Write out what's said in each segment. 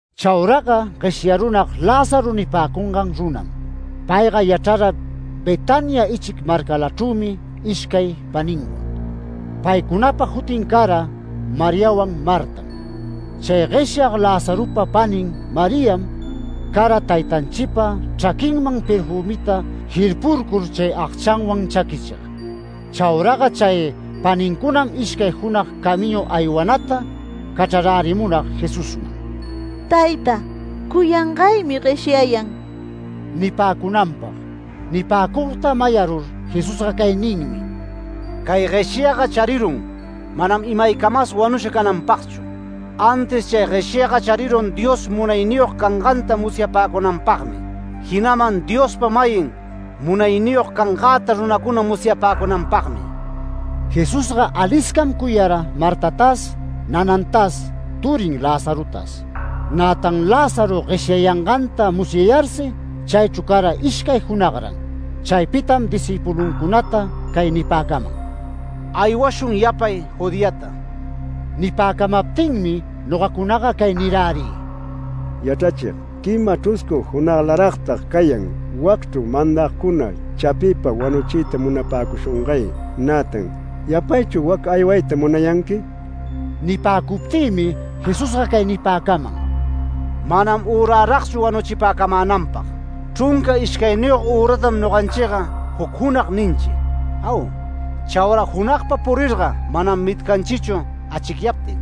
Chauraga gueshyarunag Lázaro nipäcungan runam. Payga yachrara Betania ichic marcalachrümi ishcay paninwan. Paycunapa jutin cara Mariawan Martam. Chay gueshyag Lazaropa panin Mariam cara taytanchipa chraquinman perfümita jirpurcur chay agchanwan chaquichig. Chauraga chay panincunam ishcay junag camiñu aywanata cachrarärimunag Jesusman “Tayta, cuyangaymi gueshyayan” nipäcunanpag. Nipäcugta mayarur Jesusga cay ninmi: “Cay gueshyaga charirun manam imaycamas wanusha cananpagchu. Antis chay gueshyaga charirun Dios munayniyog cananganta musyapäcunanpagmi, jinaman Diospa-mayin munayniyog cangäta runacuna musyapäcunanpagmi”. Jesusga aliscam cuyara Martatas nanantas turin Lazarotas. Nätan Lázaro gueshyayanganta musyayarsi chaychru cara ishcay junagran. Chaypitam discïpuluncunata cay nipäcaman: “Aywashun yapay Judeata”. Nipäcamaptinmi nogacunaga cay nirärï: “Yachrachig, quima chruscu junaglaragtag cayan wacchru mandagcuna chapiypa wanuchiyta munapäcushungay. Nätan ¿yapaychu wac aywayta munayanqui?” Nipäcuptïmi Jesusga cay nipäcaman: “Manam üraragchu wanuchipäcamänanpag. Chrunca ishcayniyog üratam noganchiga juc junag ninchi. ¿Au? Chaura junagpa purirga manam mitcanchichu achicyaptin.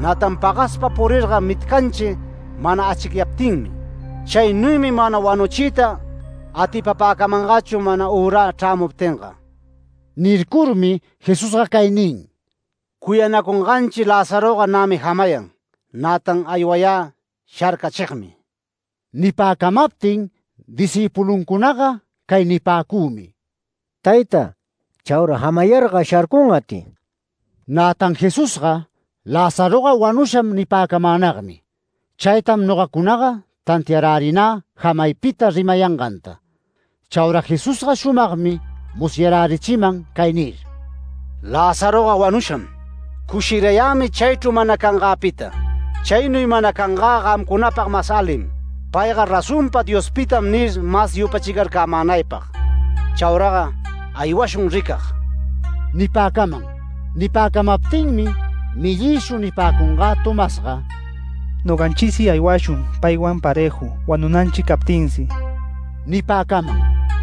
Nätan pagaspa purirga mitcanchi mana achicyaptinmi. Chaynuymi mana wanuchiyta atipapäcamangachu mana ürä chrämuptinga”. Nircurmi Jesusga cay nin: “Cuyanacunganchi Lazaroga nämi jamayan. Nätan aywayä sharcachigmi”. Nipäcamaptin discïpuluncunaga cay nipäcümi: “Tayta, chaura jamayarga sharcungachri”. Nätan Jesusga Lázaro wanusham nipäcamänagmi. Chaytam nogacunaga tantiarärinä jamaypita rimayanganta. Chaura Jesusga shumagmi musyarärichiman cay nir: “Lazaroga wanusham. Cushirayämi chaychru mana cangäpita. Chaynuy mana cangä gamcunapag mas alim, ‘Payga razonpa Diospitam’ nir mas yupachicarcämänaypag. Chauraga aywashun ricag” nipäcaman. Nipäcamaptinmi mellïshu nipäcungä Tomasga: “Noganchisi aywashun paywan parëju wanunanchi captinsi” nipäcaman.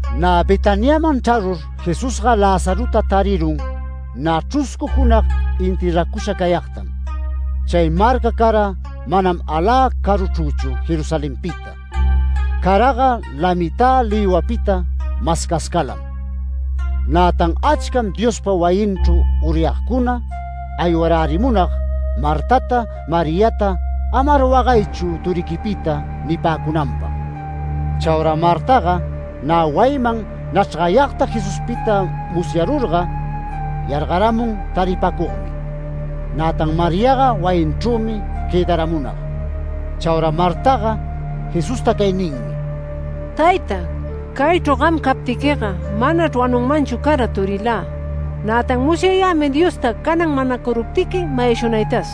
Nä Betaniaman chrarur Jesusga Lazarota tarirun nä chruscu junag enterracusha cayagtam. Chay marca cara manam alä caruchrüchu Jerusalenpita. Caraga lamitä lïwapita mascascalam. Nätan achcam Diospa wayinchru uryagcuna aywarärimunag Martata Mariata “Amar wagaychu turiquipita” nipäcunanpag. Chaura Martaga nä wayinman nachrgayagta Jesuspita musyarurga yargaramun taripacugmi, nätan Mariaga wayinchrümi quëdaramunag. Chaura Martaga Jesusta cay ninmi: “Tayta, caychru gam captiquiga manachr wanunmanchu cara turilä. Nätan musyayämi Diosta canan manacuruptiqui mayashunaytas”.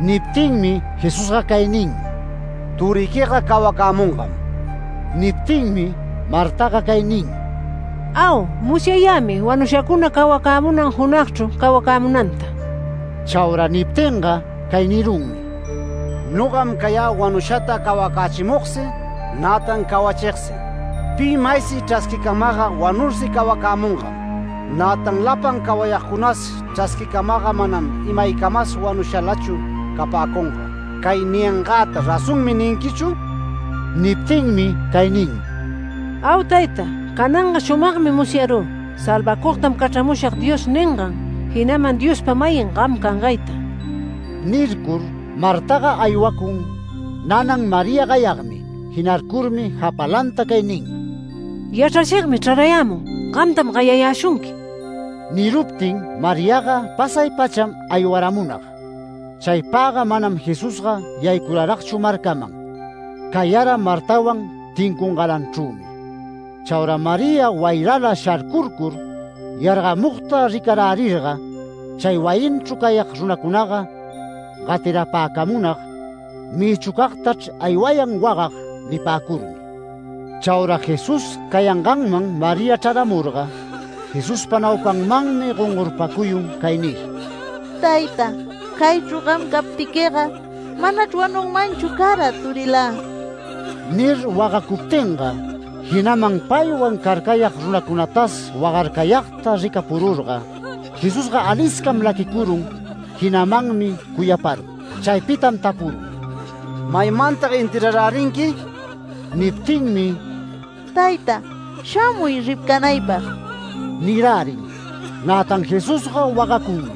Niptinmi Jesusga cay nin: “Turiquiga cawacämungam”. Niptinmi Martaga cay nin: “Au. Musyayämi wanushacuna cawacämunan junagchru cawacämunanta”. Chaura niptinga cay nirunmi: “Nogam cayä wanushata cawacächimugsi, nätan cawachigsi. Pi maysi chrasquicamagga wanursi cawacämungam. Nätan lapan cawayagcunasi chrasquimagga manam imaycamas wanushalachu capäcunga. ¿Cay niyangäta ‘Razonmi’ ninquichu?” Niptinmi cay nin: “Au tayta. Cananga shumagmi musyarü ‘Salvacugtam cachramushag’ Dios ningan jinaman Diospa-mayin gam cangayta”. Nircur Martaga aywacun nanan María gayagmi. Jinarcurmi japalanta cay nin: “Yachrachigmi chrarayämun. Gamtam gayayäshunqui”. Niruptin Mariaga pasay-pacham aywaramunag. Chaypagga manam Jesusga yaycuraragchu marcaman. Cayara Martawan tincungalanchrümi. Chaura María wayrala sharcurcur yargamugta ricarärirga chay wayinchru cayag runacunaga gatirapäcamunag “Mïchucagtachr aywayan wagag” nipäcurmi. Chaura Jesús cayanganman María chraramurga, Jesuspa naupanmanmi gongorpacuyun cay nir: “Tayta, caychru gam captiquiga manachr wanunmanchu cara turilä” nir, wagacuptinga, jinaman paywan carcayag runacunatas wagarcayagta ricapururga Jesusga aliscam laquicurun jinamanmi cuyaparun. Chaypitam tapurun: “¿Maymantag enterrarärinqui?” Niptinmi “Tayta, shamuy ricanaypag” nirärin. Nätan Jesusga wagacunmi.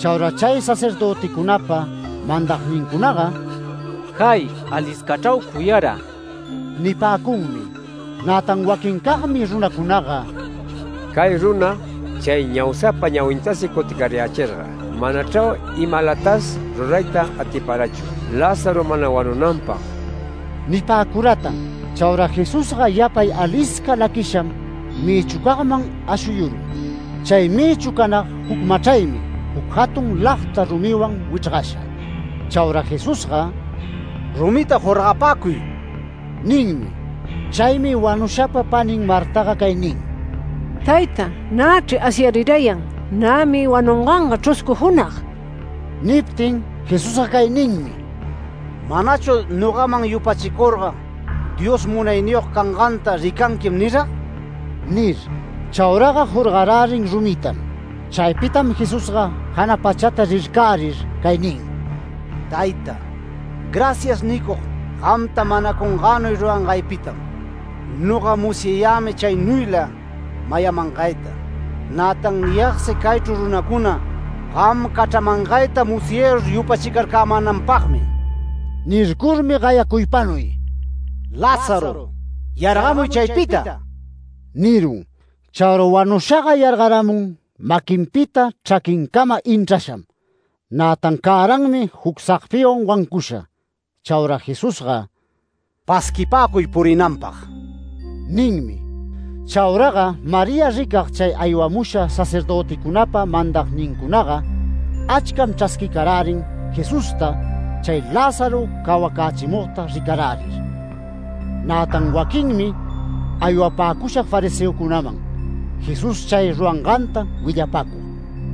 Chaura chay sacerdöticunapa mandagnincunaga “¡Jay, aliscachrau cuyara!” nipäcunmi. Nätan waquincagmi runacunaga “Cay runa chay ñaushapa ñawintas cuticayächirga manachrau imalatas rurayta atiparachu Lázaro mana wanunanpag” nipäcuratan. Chaura Jesusga yapay alisca laquisham mïchucagman ashuyurun. Chay mïchu canag juc machraymi juc jatun lagta rumiwan wichrgasha. Chaura Jesusga “Rumita jorgapäcuy” ninmi. Chaymi wanushapa panin Martaga cay nin: “Tayta, nächri asyarirayan, nämi wanunganga chruscu junag”. Niptin Jesusga cay ninmi: “¿Manachu nogaman yupachicurga Dios munayniyog canganta ricanquim nirag?” nir. Chauraga jorgarärin rumitam. Chaypitam Jesusga jana pachata rircärir cay nin: “Tayta, ‘Gracias’ nicug, gamta manacungänuy rurangaypitam. Noga musyayämi chaynuyla mayamangayta. Nätan niyagsi caychru runacuna, gam cachramangayta musyarur yupachicarcämänanpagmi”. Nircurmi gayacuypanuy: “¡Lázaro, yargamuy chaypita!” nirun. Chaura wanushaga yargaramun maquinpita, chraquincama inchrasham. Nätan cäranmi juc sagpiwan wancusha. Chaura Jesusga “Pasquipäcuy purinanpag” ninmi. Chauraga María ricag chay aywamusha sacerdöticunapa mandagnincunaga achcam chrasquicarärin Jesusta chay Lázaro cawacächimugta ricarärir. Nätan waquinmi aywapäcusha fariseocunaman Jesús chay ruranganta willapacug.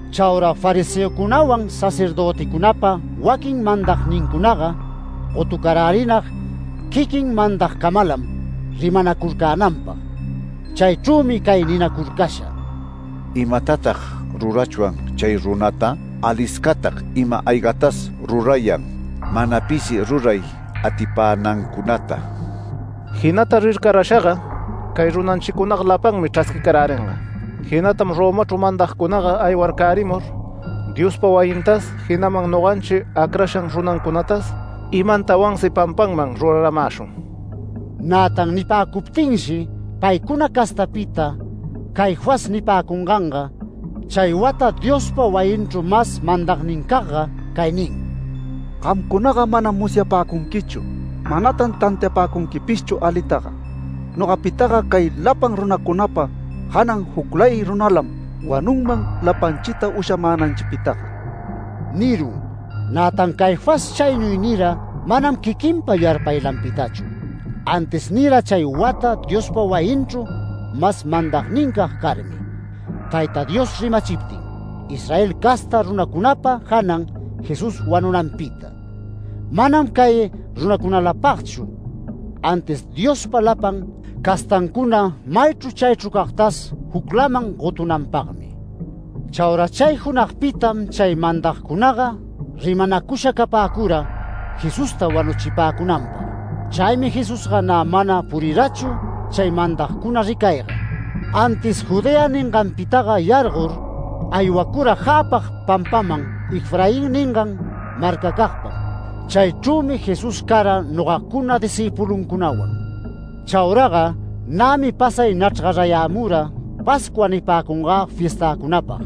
Chaura fariseocunawan sacerdöticunapa waquin mandagnincunaga gotucarärinag quiquin mandagcamalam rimanacurcänanpag. Chaychrümi cay ninacurcasha: “¿Imatatag rurachwan chay runata? Aliscatag ima-aygatas rurayan mana pisi ruray atipänancunata. Jinata rircarashaga cay runanchicunaga lapanmi chrasquicaräringa. Jinatam Romachru mandagcunaga aywarcärimur Diospa wayintas jinaman noganchi acrashan runancunatas imantawansi pampanman rurarämäshun”. Nätan nipäcuptinshi paycuna castapita Caifás nipäcunganga, chay wata Diospa wayinchru mas mandagnincagga cay nin: “Gamcunaga manam musyapäcunquichu. Manatan tantiapäcunquipishchu alitaga. Nogapitaga cay lapan runacunapa janan juclay runalam wanunman lapanchita ushamänanpitaga” nirun. Nätan Caifás chaynuy nira manam quiquinpa yarpaylanpitachu, antis nira chay wata Diospa wayinchru mas mandagnincag carmi, Tayta Dios rimachiptin, Israel casta runacunapa janan Jesús wanunanpita. Manam cay runacunalapagchu, antis Diospa lapan castancuna maychru chaychru cagtas juclaman gotunanpagmi. Chaura chay junagpitam chay mandagcunaga rimanacusha capäcura Jesusta wanuchipäcunanpag. Chaymi Jesusga nä mana purirachu chay mandagcuna ricayga. Antis Judea ninganpitaga yargor, aywacura jäpag pampaman Efraín ningan marcacagpam. Chaychrümi Jesús cara nogacuna discïpuluncunawan. Chauraga nämi pasay nachrgarayämura Pascua nipäcungä fiestäcunapag.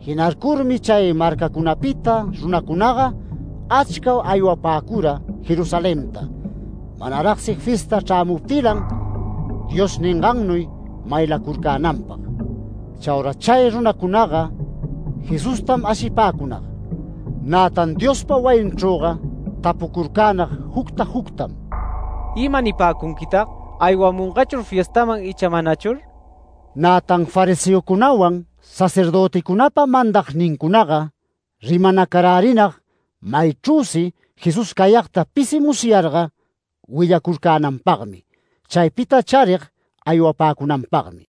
Jinarcurmi chay marcacunapita runacunaga achca aywapäcura Jerusalenta manaragsi fiesta chrämuptilan Dios ningannuy maylacurcänanpag. Chaura chay runacunaga Jesustam ashipäcunag, nätan Diospa wayinchrüga tapucurcänag jucta juctam: “¿Ima nipäcunquitag? ¿Aywamungachur fiestaman icha manachur?” nir. Nätan fariseocunawan, sacerdöticunapa mandagnincunaga rimanacarärinag maychrüsi Jesús cayagta pisi musyarga willacurcänanpagmi, chaypita charig aywapäcunanpagmi.